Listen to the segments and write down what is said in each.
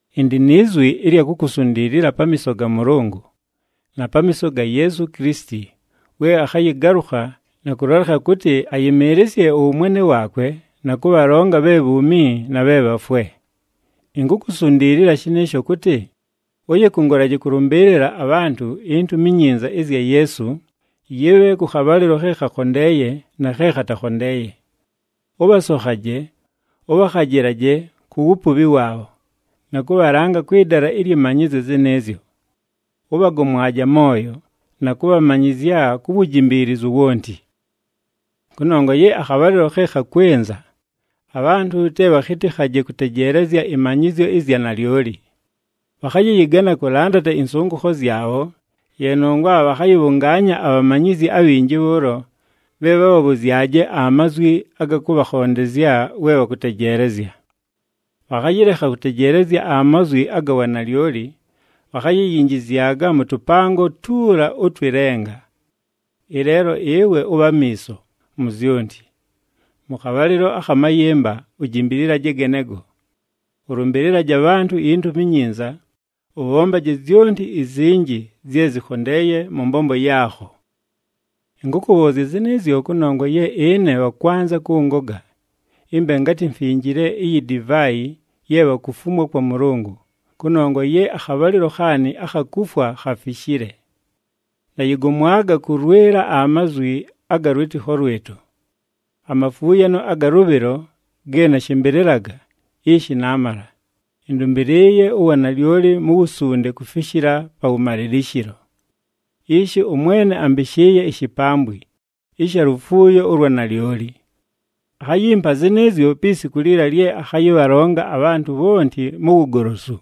Ɨndɨ ni zwi ɨlya kukusundiilila pamiiso ga Mʉlʉngʉ, na pamiiso ga Yeesu Kilisiti we akhayɨgalʉkha na kʉlolekha kʉtɨ, ayɨmɨɨlɨsye ʉwʉmwene waakwe, na kʉbhalonga bhe bhuumi na bhe bhafwe. Inkukusundiilila shɨnɨɨsho kʉtɨ, ʉyɨkʉngʉlaje kʉlʉmbɨɨlɨla abhantʉ iNtumi iNyinza ɨzya Yeesu, yɨbhe kʉ khabhalɨlo khe khakhondeeye na khe khatakhondeeye. Ʉbhasokhaje, ʉbhakhajɨlaje ku wupubhi waabho, na kʉbhalanga kwɨ dala ɨlyɨ manyɨzyo zɨnɨɨzyo. Ʉbhagomwaje amooyo, na kʉbhamanyɨzya ku wujimbiilizu wonti. Kʉnongwa ye akhabhalɨlo khe khakwɨnza, abhantʉ te bhakhɨtɨkhaje kʉtejeelezya ɨmanyɨzyo ɨzya nalyoli. Bhakhayɨyɨgana kʉlandata ɨnsʉngʉkho zyabho, ye nongwa bhakhayɨbhʉngaanya abhamanyizi abhinji bhʉʉlo, bhe bhabhabhʉzyaje amazwi aga kʉbhakhondezya we bhakʉtejeelezya. Bhakhayɨlekha kʉtejeelezya amazwi aga wanalyoli, bhakhayiyinjizyaga mʉ tʉpango tuula ʉtwɨ lenga. Ɨleelo ɨwe ʉbhe amiiso mu zyonti. Mʉ khabhalɨlo akha mayɨmba, ujimbililaje genego. Ʉlʉmbɨlɨlaje abhantʉ iNtumi iNyinza, ʉbhombaje zyonti izinji zye zɨkhondeeye mʉ mbombo yaakho. Ɨnkʉkʉbhʉʉzya zɨnɨɨzyo kʉnongwa ye ɨne bhakwanza kʉngoga ɨmbe ngatɨ mfinjile iyi divaayi ye bhakufumwa kwa Mʉlʉngʉ, kʉnongwa ye akhabhalɨlo khaanɨ akha kufwa khafishile. Nayɨgomwaga kʉlwɨla amazwi aga lwɨtɨkho lwɨtʉ. Amafuuyano aga lʉbhɨlo ge nashɨmbɨlɨlaga, ishi naamala, ɨndʉmbɨlɨɨye uwanalyoli mu wusunde kufishila pa wʉmalɨlɨshɨlo. Ishi ʉMwene ambɨshɨɨye ishipambwi ɨsha lufuuyo ʉlwa nalyoli. Akhayimpa zɨnɨɨzyo pi siku liila lye akhayɨbhalonga abhantʉ bhonti mu wugolosu.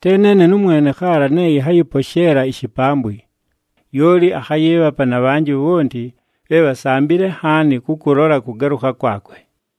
Te neene nʉmwene khaala ne ɨnhayɨposheela ishipambwi, lyoli akhayɨɨbhapa na bhanjɨ bhonti bhe bhasambile nhaani kʉkʉlola kʉgalʉkha kwakwe.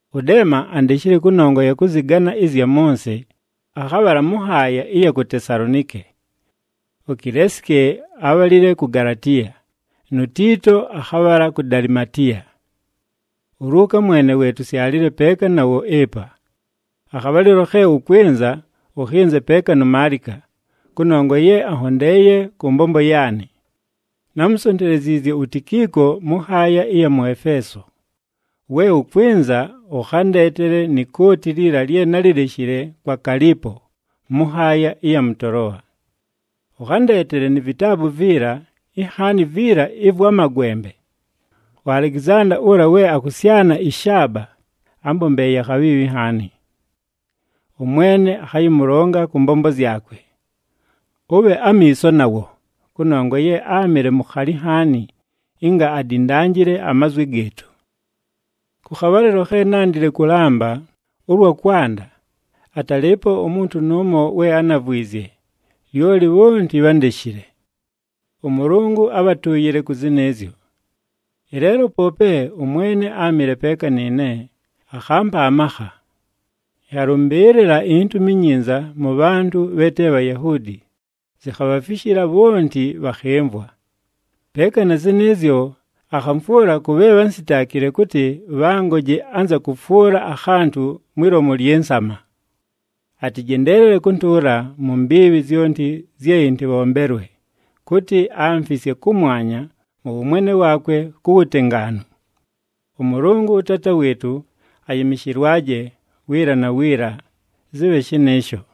ɄDeema andeshile kʉnongwa ya kʉzɨgana ɨzya mʉ nsɨ, akhabhala mʉ nhaaya ɨya ku Tesalonike. UKileesike abhalile ku Galatiya, nu Tiito akhabhala ku Dalimatiya. ULuuka mwene we tusyalile peeka nawo ɨpa. Akhabhalɨlo khe ʉkwɨnza, ʉkhɨnze peeka nu Maalika, kʉnongwa ye anhondeeye kʉ mbombo yaanɨ. Námusonteleziizye uTikiiko mʉ nhaaya ɨya mʉ Efeeso. We ʉkwɨnza, ʉkhandeetele ni kooti liila lye nálileshile kwa Kaalipo mʉ nhaaya ɨya mʉ Toloa. Ʉkhandeetele ni vitaabu viila, inhaani viila ɨvwa magwembe. UAlekizanda, ʉla we akʉsyana ɨshaaba, ámbombeeye akhabhiibhi nhaani. ɄMwene akhayɨmʉlonga kʉ mbombo zyakwe. Ʉbhe amiiso nawo, kʉnongwa ye áamɨle mukhali nhaani ɨnga adindanjile amazwi gɨɨtʉ. Kʉ khabhalɨlo khe nándile kʉlamba ʉlwa kwanda, atalɨɨpo umuntu nʉʉmo we ánavwizye, lyoli bhonti bhándeshile. ɄMʉlʉngʉ abhatʉʉyɨle kʉ zɨnɨɨzyo. Ɨleelo poope, ʉMwene áamɨle peeka nɨɨne, akhampa amakha. Ɨnhalʉmbɨɨlɨla iNtumi iNyinza mʉ bhantʉ bhe te Bhayahuudi, zikhabhafishila bhonti bhakhɨmvwa. Peeka na zɨnɨɨzyo, akhamfwʉla kʉ bhe bhánsitaakile kʉtɨ, bhangoje anza kʉfwʉla akhantʉ mwi lomu lyɨ nsama. Atɨjendeelele kʉntʉʉla mu mbiibhi zyonti zye ɨntɨbhombelwe, kʉtɨ, amfisye kʉmwanya mʉ wʉmwene waakwe ku wutengaanu. ɄMʉlʉngʉ, ʉTaata wɨɨtʉ, ayɨmɨshɨlwaje, wiila na wiila! Zɨbhe shɨnɨɨsho!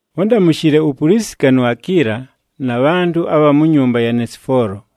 Ʉndamʉshɨle uPulisika nu Akiila, na bhantʉ abha mu nyumba ya Nesifoolo.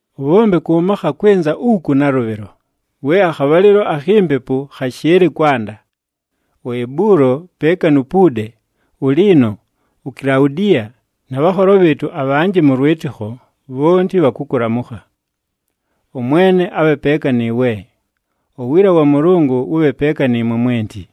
Ʉbhombe kʉ makha kwɨnza uku nalʉbhɨlo, we akhabhalɨlo akhi mpepu khashɨɨlɨ kwanda. UEbulo, peeka nu Puude, uLiino, uKilaudiya, na bhanholo bhɨɨtʉ abhanjɨ mʉ lwɨtɨkho bhonti bhakʉkʉlamʉkha. ɄMwene abhe peeka nɨɨwe. Uwiila wa Mʉlʉngʉ wʉbhe peeka nɨɨmwe mwenti.